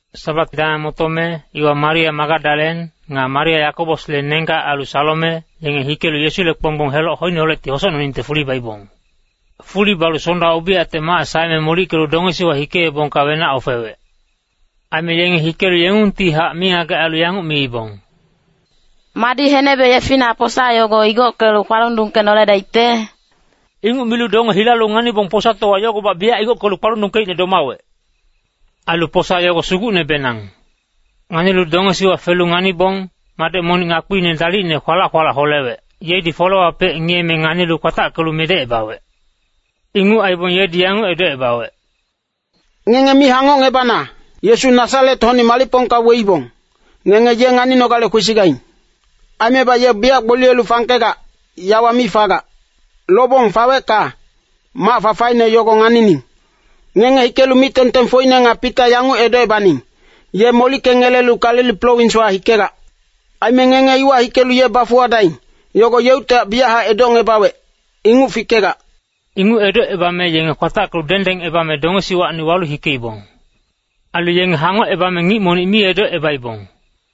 Sabat dameng motome, iwa Maria Magadalen, nga Maria Yakobosle nenggac ailu Salome, yenge hikelu Yesule kponggbong heloc hoineholecti hosocnoningte fuli baibong. Fuli balu Sonda ubiyacte mac saeme molickelu dongesiwa hikeebongka wenac ofewec. Aime yenge hikelu yengungtihac mingagec ailu yanguc miibong, “Madi henebe yefina posa yogo igockelu kpalundungkenoledaicte?” Inguc milu donge hilalu nganibong posatowa yogobac biyac igockelu kpalundungkeicne domawec. Ailu posa yogo sugucnebenang. Nganilu dongesiwa felu nganibong, madec monic ngakpiine dalicne kwalac-kwalac holewec, yedi folewapec ngiyeme nganilu kwatackelu medecebawec. Inguc aibong yedi yanguc edocebawec, “Ngenge mi hangocngebana. Yesu Nasaret-hocni malicpongka weibong, ngenge ye nganinogale kwesigaing. Aimebac ye biyac gboliyelu fangkegac, yawa mi fagac. Lobong fawecka, mac fafaine yogo nganining. Ngenge hikelu mic-tengtengfocine nga Pita yanguc edocebaning, ‘Ye molickengelelu Galili prowinswa hikegac. Aime ngenge iwa hikelu ye bafuwadaing, yogo yeuctihac biyachac edocngebawec, inguc fikegac.’” Inguc edocebame yenge kwatackelu dengdengebame dongesiwacni walu hikeibong. Ailu yenge hangocebame ngic monic mi edocebaibong.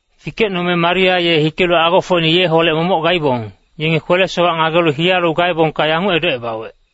Fikecnome Maria ye hikelu agofocine yeholec momoc gaibong, yenge kwele-sowac ngagelu hiyalu gaebongka yanguc edocebawec,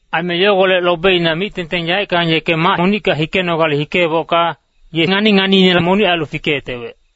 Aime yogolec lobeina mic-tengteng yaeckang yeke mac monicka hikenogale hikeebocka, ye ngani-nganiine monic ailu fikeyetewec.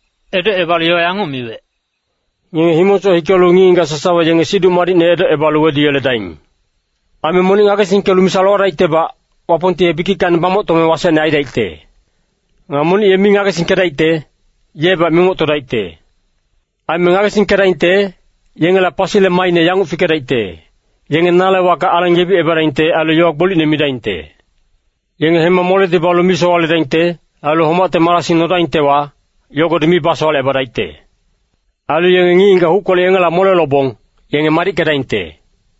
Edocebalu yowa yanguc miwec, “Ngenge himongsoc hikelu ngic-ngigac sasawa yenge Siduc Madicne edocebalu weduyeledaing. “Aime monic ngagesingkelu misa lowadaictebac, Wapongti ye bikickacni bamoctome wasecne aidaicte. Nga monic ye mi ngagesingkedaicte, yebac mimoctodaicte. Aime ngagesingkedaingte, yengela pasile maaine yanguc fikedaicte, yenge nale wacka aleng yebicebadaingte ailu yowa gbolicne midaingte. Yenge hema moledi balu mi sowaledaingte. Ailu homacte marasing nodaingtewa, yogodi mi basowalecebadaicte. Ailu yenge ngic-ngigac huckolec yengela mole lobong, yenge madickedaingte.”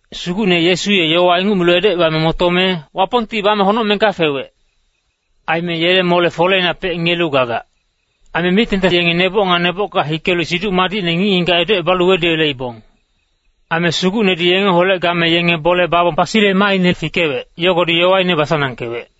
Sugucne Yesu ye yowa inguc milu edocebame motome, Wapongti bame honocmengka fewec. Aime yele mole-foleinapec ngiyelu gagac. Aime mic-tengteng yenge neboc nga nebocka hikelu Siduc Madicne ngic-ngigac edocebalu weduyeleibong. Aime Sugucnedi yengeholec game yenge bole babong pasile maaine fikewec, yogodi yowaine basanangkewec.]